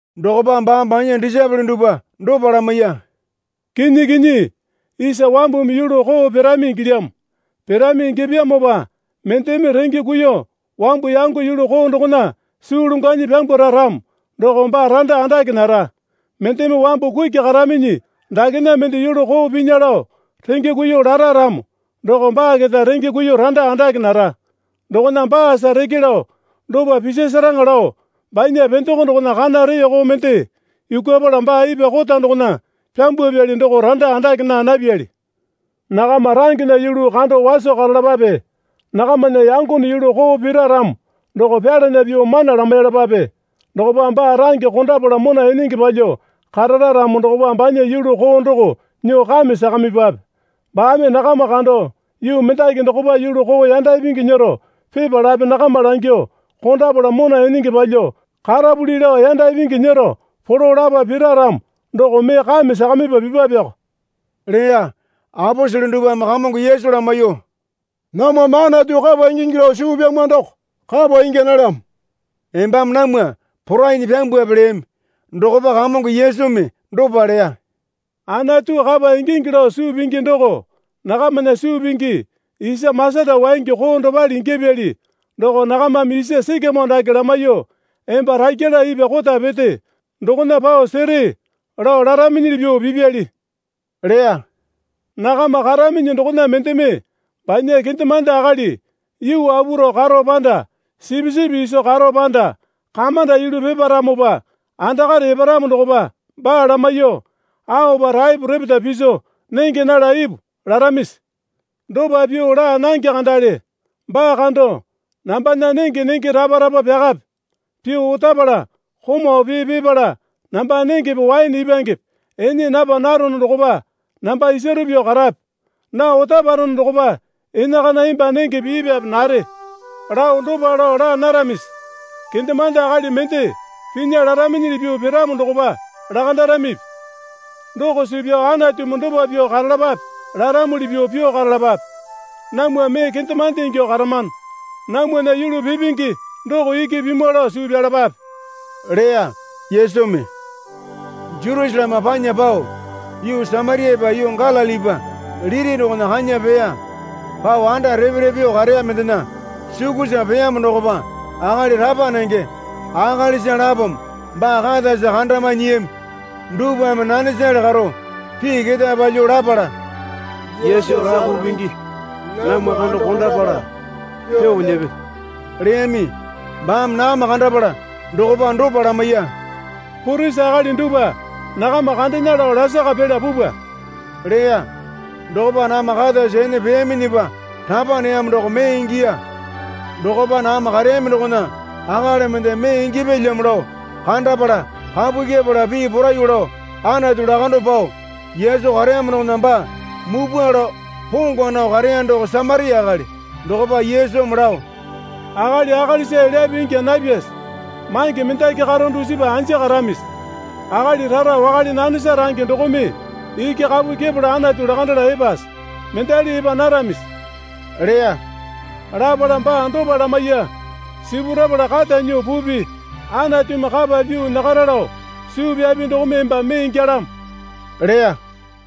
Dokopa baame banya disaepole dupwa dopa lamaiya. Kinyi kinyi, isa wambumi yulu koo pirami ingilyamo. Pirami ingyapyamopa mendeme renge kuiyuo wambu yango yulu koo dokona suu longwanyi pyambwara ramo doko baa randa andake nara. Mendeme wambu kuki karaminyi dakena mende yulu koo pinya lao renge kuiyuo lara ramo doko baa keta renge kuiyuo randa andake nara. Dokona baasa reke lao dopa pisasaraŋa lao banya pendeko dokona kana reko mende yukwapala baa ipwa kota dokona pyambwapyali doko randa andake naa napyali. Nakama rangena yulu kando waso karalapape. Nakamana yangone yulu koo pira ramo doko pyalana pyuo mana lamaiyalapape. Dokopa baa range kondapala mona enenge palyuo karara ramo dokopa banya yulu koo doko nyuo kame sakamipwape. Baame nakama kando yuu mendaki dokopa yulu koo yanda ipingi nyero pipalape nakama langyuo, Kondapala mona enenge palyuo karapuli lao yanda ipingi nyero polo lapa pira ramo doko mee kame sakamipa pipapeko, leya. Aposele dupwame Kamongo Yesu lamaiyuo, Namwame Anatu kapa ingingi lao suu pyamwa doko kapa ingya nalyamo, embame namwa porainyi pyambwape leyami. Dokopa Kamongo Yesumi dopa leya. Anatu kapa ingingi lao suu pingi doko nakamana suu pingi isa masata waingi koo dopale ingyapyali doko nakamame isa sikamoo dake lamaiyuo, Emba rakyala ipwa kota pete dokona pao sere, lao laraminyili pyuo pipyali, leya. Nakama karaminyi dokona mendeme banya kendemande akali yuu apu rao karo panda sipisipi iso karo panda kamanda yulu piparamopa andakare eparamo dokopa baa lamaiyuo, Aopa taepo repeta piso nenge nala ipu, laramisi? Dopa pyuo laa nange kandale. Baa kando, Nambana nenge nenge rapa rapa pyakape. Pyuo otapala komau pee pipala namba nengepe waene ipwangepe ene napa narono dokopa namba isaru pyuo karape. Nao otaparono dokopa enakana emba nengepe ipwape nare, lao dopa lao laa naramisi? Kendemande akali mende pinya laraminyili pyuo piramo dokopa lakandaramipi? Doko suu pyao Anatumi dopa pyuo karalapape laramuli pyuo pyuo karalapape. Namwa mee kendemande ingyuo karamano. Namwana yulu pipingi doko iki pimwa lao suu pyalapape, leya Yesumi. Jerusaleme panya pao yuu Samariapa yuu Galilipa liti dokona kanya peya. Pao anda repe repe pyuo kareya mendena sukusa peyamo dokopa akali rapa nenge akalisa lapome baa katasa kandamae nyiyami. Dupwame nanesale karo pii ketae palyuo lapala, Yesu Rapu Pingi, namwa kando kondapala pyuo nyepe leyami. Baame nakama kandapala dokopa dopa lamaiya. Purisi akali dupwa nakama kandena lao lasaka pela pupwa leya. Dokopa nakama katasa ene peyaminyipa rapa neyamo doko mee ingiya. Dokopa nakama kareyami dokona akali mende mee ingyapyalyamo lao kandapala kapu kyepala pii poraiyuo lao Anatu lakando pao Yesu kareyamo dokona baa mupwa lao pongwa nao kareya doko Samaria akali. Dokopa Yesumi lao, Akali akalisa elyape ingya napyase? Mange mendaki karo dusipa anja karamisi? Akali rara wakale nanesa range dokome iki kapu kyepala Anatu lakandala epase? Mendali epa naramisi? leya. Lapala baa dopa lamaiya. Sipurapala kata nyuo pupi. Anatumi kapa pyuo nyakara lao suu pyapi dokome emba mee ingyalamo leya.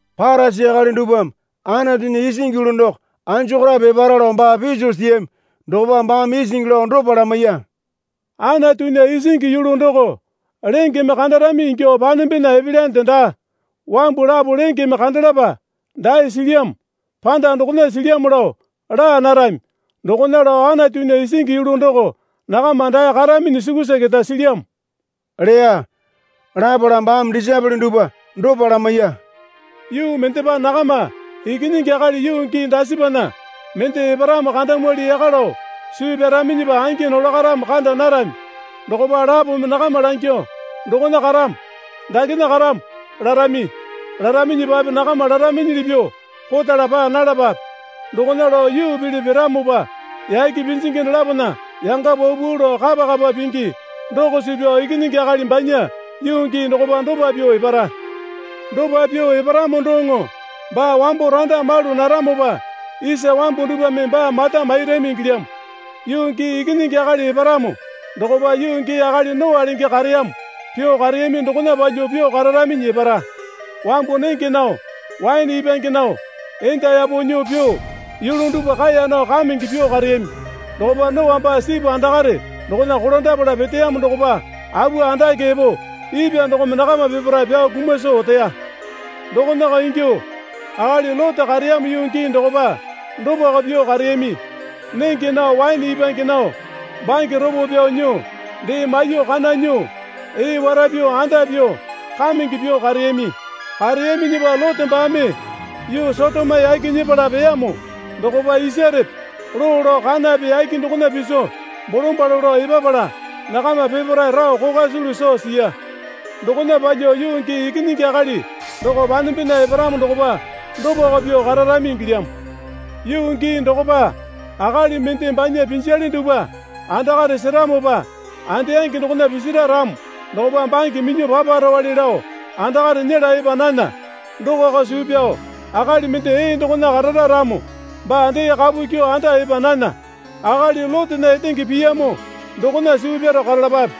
Parisi akali dupwame, Anatunya isingi yulu doko anjokorape epara, lao baa piso siyami dokopa baame isingi lao dopa lamaiya. Anatunya isingi yulu doko lengeme kandarami ingyuo panembena epelyande daa. Wambu lapo lengeme kandalapa, dae silyamo, panda dokona silyamo lao, laa narami. Dokona lao Anatunya isingi yulu doko nakama dae karaminyi sukusa keta silyamo, leya. Lapala baame disaepole dupwa dopa lamaiya. Yuu mendepa nakama Ikinyingi Akali yuu gii dasipana mende eparamo kandamwali yaka lao suu pyaraminyipa angi nolakaramo kanda narami. Dokopa lapome nakama langyuo, Dokona karamo, dakena karamo, larami. Laraminyipape nakama laraminyili pyuo kotala paa nalapape. Dokona lao yuu pele piramopa yake pinjingi dolapona yanga paupau lao kapa kapa pingi doko suu pyao Ikinyingi Akali banya yuu gii dokopa dopa pyuo epara. Dopa pyuo eparamo doŋo baa wambo randa malu naramopa isa wambu dupwame baa mata mairami ingilyamo. Yuu gii Ikinyingi Akali eparamo dokopa yuu gii akali Noa lenge kareyamo pyuo kareyami dokona palyuo pyuo kararaminyi epara. Wambu nenge nao, waene ipwange nao, enda yapo nyuo pyuo yulu dupwa kaeya nao kamenge pyuo kareyami. Dokopa Noa baa sipu andakare dokona kolandapala peteyamo dokopa apu andake epo ipwa dokome nakama peparae pyao kuma soo oteya. Dokonako ingyuo akali Lote kareyamo yuu gii dokopa dopako pyuo kareyami. Nenge nao waene ipwange nao bange ropo pyao nyuo dee maiyuo kana nyuo, ee wara pyuo anda pyuo kamenge pyuo kareyami. Kareyaminyipa Lote baame yuu Sotoma yaki nyepala peyamo dokopa isarepe loo lao kanape yake dokona piso bolombalo lao epapala nakama peparae rao kokwa sulu soo siya. Dokona palyuo yuu gii Ikinyingi Akali doko panembena eparamo dokopa dopako pyuo kararami ingilyamo. Yuu gii dokopa akali mende banya pinjale dupwa andakare seramopa andeyangi dokona pisira ramo dokopa bange minyuo paparowale lao andakare nyela epa nana. Dokoko suu pyao akali mende ee dokona karara ramo baa dee kapu kyuo anda epa nana. Akali Lotena etenge piyamo dokona suu pyaro karalapape.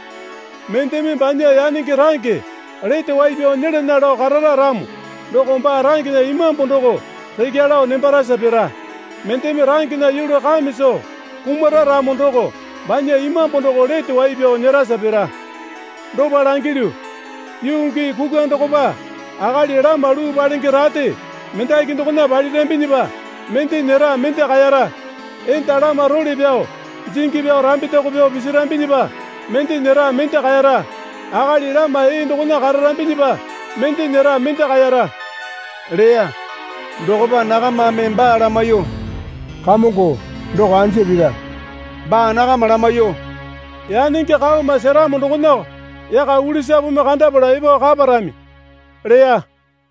Mendeme banya yanenge range lete wai pyao nyelana lao karara ramo doko baa rangena imambu doko rekya lao nembarasa pira. Mendeme rangena yulu kame soo kumara ramo doko banya imambu doko lete wai pyao nyerasa pira. Dopa langilyu, yuu gii kukwa dokopa akali lama luu palenge rate mendaki dokona palirambinyipa mende nyera mende kaera. Enda lama role pyao jingi pyao rambetaku pyao pisirambinyipa mende nyera mende kaera. Akali lama ee dokona kararambinyipa mende nyera mende kaera leya. Dokopa nakamame baa lamaiyuo, Kamongo doko anja pira? leyami. Baa nakama lamaiyuo, Yanenge kaoma seramo dokonako yaka ulisapumi kandapala epo kaparami leya.